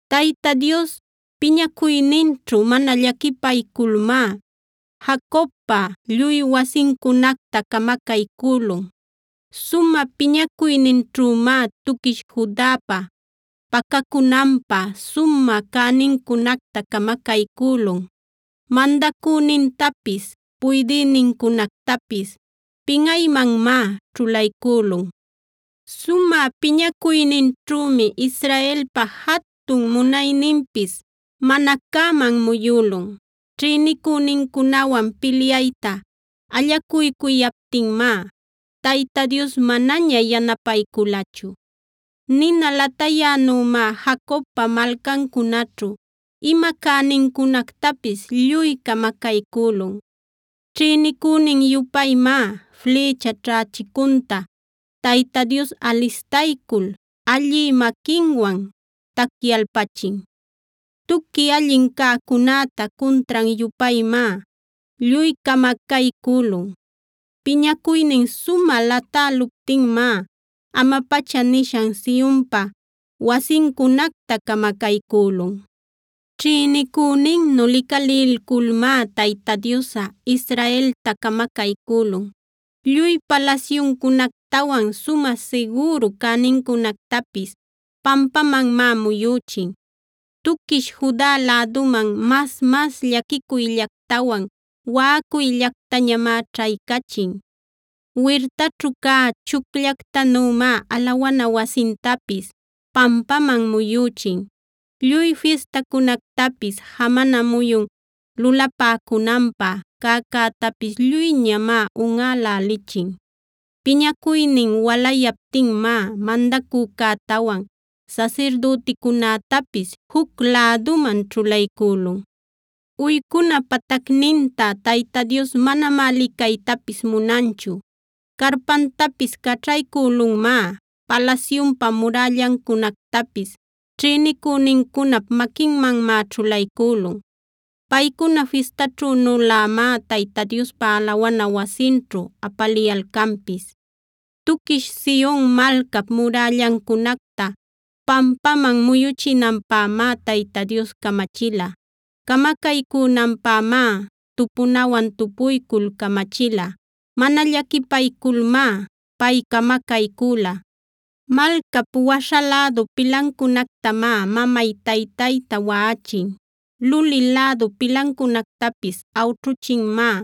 Tayta Dios piñacuyninćhu mana llaquipayculmá Jacobpa lluy wasincunacta camacaycülun. Sumä piñacuyninćhümá tuquish Judapa pacacunanpä sumä cänincunacta camacaycülun. Mandacünintapis, puydïnincunactapis pinꞌaymanmá ćhulaycülun. Sumä piñacuyninćhümi Israelpa jatun munayninpis mana cäman muyülun. Ćhïnicünincunawan pilyayta allacuycuyaptinmá, Tayta Dios manaña yanapayculachu. Nina latayänümá Jacobpa malcancunaćhu ima cänincunactapis lluy camacaycülun. Ćhïnicünin-yupaymá flïcha ćhächicunta Tayta Dios alistaycul allï maquinwan tacyalpachin. Tuqui allin cäcunäta cuntran-yupaymá lluy camacaycülun. Piñacuynin sumä latäluptinmá ama-pacha nishan Sionpa wasincunacta camacaycülun. Ćhïnicüninnu licalilculmá Tayta Diosꞌa Israelta camacaycülun. Lluy palasyuncunactawan sumä sigüru cänincunactapis pampamanmá muyüchin. Tuquish Juda läduman mas-mas llaquicuyllactawan waꞌacuyllactañamá ćhaycachin. Wirtaćhu cä chucllactanümá alawana wasintapis pampaman muyüchin. Lluy fistacunactapis, jamana muyun lulapäcunanpä cäcätapis lluyñamá unꞌälälichin.b Piñacuynin walayaptinmá mandacücätawan sasirdüticunätapis juc läduman ćhulaycülun. Uycuna patacninta Tayta Dios manamá licaytapis munanchu. Carpantapis caćhaycülunmá.c Palasyunpa murällancunactapis ćhïnicünincunap maquinmanmá ćhulaycülun. Paycuna fistaćhünülämá Tayta Diospa alawana wasinćhu apaliyalcanpis. Tuquish Sion malcap murällancunacta pampaman muyuchinanpämá Tayta Dios camachila. Camacaycünanpämá tupunawan tupuycul camachila; mana llaquipayculmá pay camacaycüla. Malcap waśha lädu pilancunactamá mamay-taytayta waꞌachin; luli lädu pilancunactapis awćhuchinmá.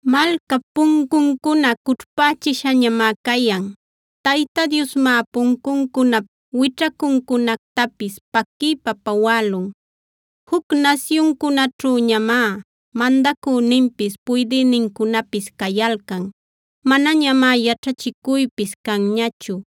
Malcap puncuncuna cućhpächishañamá cayan. Tayta Diosmá puncuncunap wićhacuncunactapis paquiypa pawälun. Juc nasyuncunaćhüñamá mandacüninpis puydïnincunapis cayalcan. Manañamá yaćhachicuypis canñachu;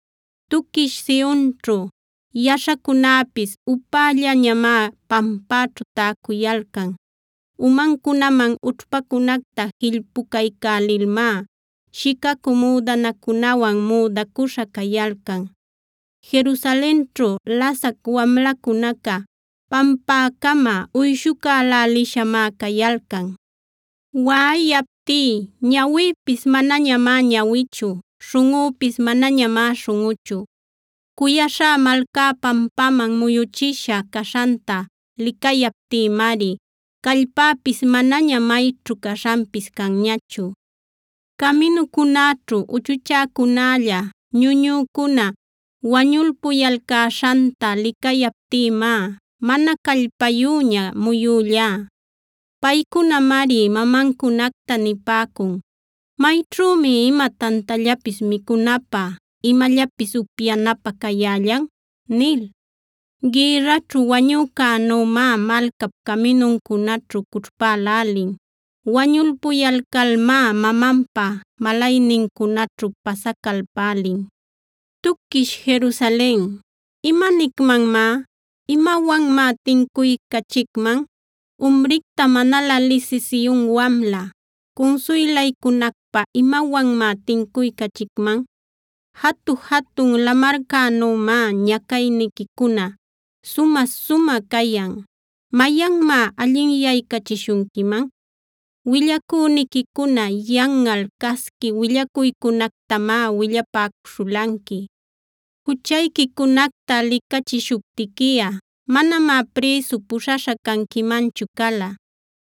Tuquish Sionćhu yaśhacunäpis upällañamá pampäćhu täcuyalcan. Umancunaman ućhpacunacta jillpucaycälilmá shicacü müdanacunawan müdacüśha cayalcan. Jerusalenćhu lasac wamlacunaca pampäcama uyshucälälishamá cayalcan. Waꞌayaptí ñawïpis manañamá ñawichu; śhunꞌüpis manañamá śhunꞌuchu. Cuyaśhá malcá pampaman muyüchisha caśhanta licayaptïmari, callpäpis manaña mayćhu caśhanpis canñachu. Caminucunäćhu uchuchäcunälla, ñuñücuna wañulpuyalcäśhanta licayaptïmá mana callpayüña muyüllá. Paycunamari mamancunacta nipäcun: “¿Mayćhümi ima tantallapis micunapä, imallapis upyanapä cayällan?” nil. Gïrraćhu wañücänümá malcap caminuncunaćhu cućhpälälin. Wañulpuyalcalmá mamanpa malaynincunaćhu pasacalpälin. Tuquish Jerusalen, ¿imanicmanmá? ¿Imawanmá tincuycachicman? Umricta manalä lisï Sion wamla, ¿cunsuylaycunacpä imawanmá tincuycachicman? Jatu-jatun lamarcänümá ñacayniquicuna sumä-sumä cayan. ¿Mayanmá allinyaycachishunquiman? Willacüniquicuna yanꞌal casqui willacuycunactamá willapäcuśhulanqui. Juchayquicunacta licachishuptiquiꞌa, manamá prïsu puśhaśha canquimanchu cala.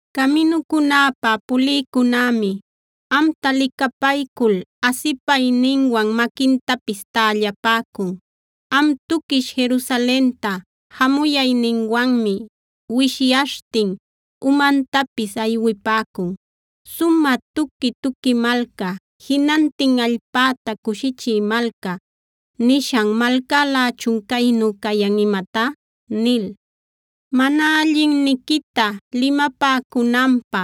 Caminucunäpa pulïcunämi amta licapaycul asipayninwan maquintapis tällapäcun. Am tuquish Jerusalenta jamuyayninwanmi wishyaśhtin umantapis aywipäcun: “¿Sumä tuqui-tuqui malca; jinantin allpäta cushichï malca, nishan malcälächun caynu cayan imatá?” nil. Mana allinniquita limapäcunanpä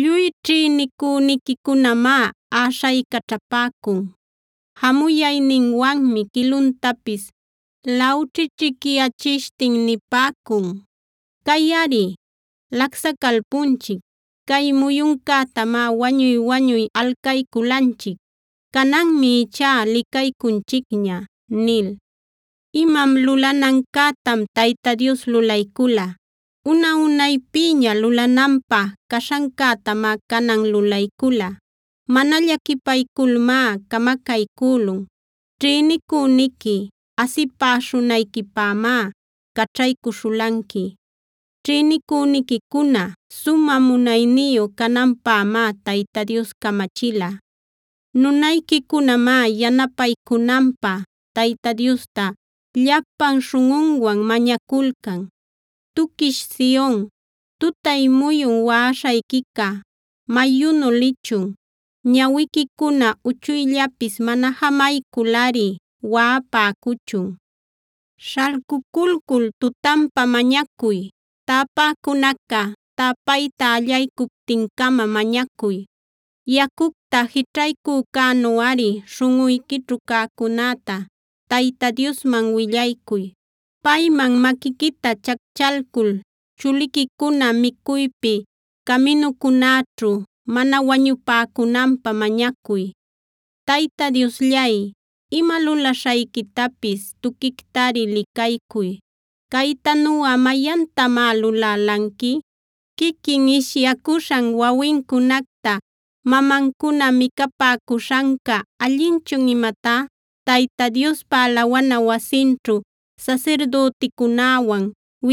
lluy ćhïnicüniquicunamá äśhaycaćhapäcun. Jamuyayninwanmi quiluntapis lawćhićhicyachishtin nipäcun: “Cayꞌari lacsacalpunchic. Cay muyuncätamá wañuy-wañuy alcayculanchic. Cananmi ichá licaycunchicña” nil. Imam lulanancätam Tayta Dios lulaycula. Una-unaypïña lulananpä caśhancätamá canan lulaycula. Mana llaquipayculmá camacaycülun.f Ćhïnicüniqui asipäśhunayquipämá caćhaycüśhulanqui. Ćhïnicüniquicuna sumä munayniyu cananpämá Tayta Dios camachila. Nunayquicunamá yanapaycunanpä Tayta Diosta llapan śhunꞌunwan mañaculcan. Tuquish Sion, tutay muyun waꞌaśhayquica mayunu lichun. Ñawiquicuna uchuyllapis mana jamayculꞌari waꞌapäcuchun. Śhalcuculcul tutanpa mañacuy; täpäcunaca täpayta allaycuptin-cama mañacuy. Yacucta jićhaycücänuꞌari śhunꞌuyquićhu cäcunäta Tayta Diosman willaycuy. Payman maquiquita chacchalcul chuliquicuna micuypi caminucunäćhu mana wañupäcunanpä mañacuy. Tayta Diosllay, ima lulaśhayquitapis tuquictari licaycuy. ¿Caytanuꞌa mayantamá lulälanqui? ¿Quiquin ishyacuśhan wawincunacta mamancuna micapäcuśhanca allinchun imatá? ¿Tayta Diospa alawana wasinćhu sasirdüticunäwan,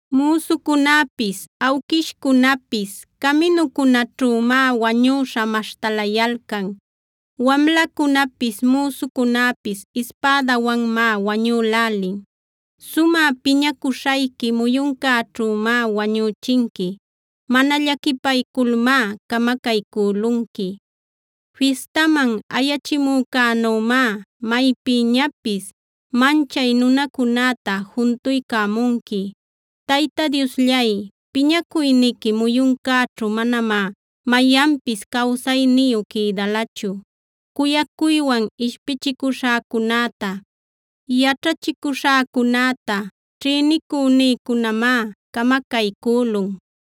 Müsucunapis awquishcunapis caminucunäćhümá wañüśha maśhtalayalcan. Wamlacunapis, müsucunapis ispädawanmá wañülälin. Sumä piñacuśhayqui muyuncäćhümá wañüchinqui; mana llaquipayculmá camacaycülunqui. Fistaman ayachimücänümá maypïñapis manchay nunacunäta juntuycämunqui.h Tayta Diosllay, piñacuyniqui muyuncäćhu manamá mayanpis cawsayniyu quïdalachu. Cuyacuywan ishpichicuśhäcunäta, yaćhachicuśhäcunäta ćhïnicünïcunamá camacaycülun.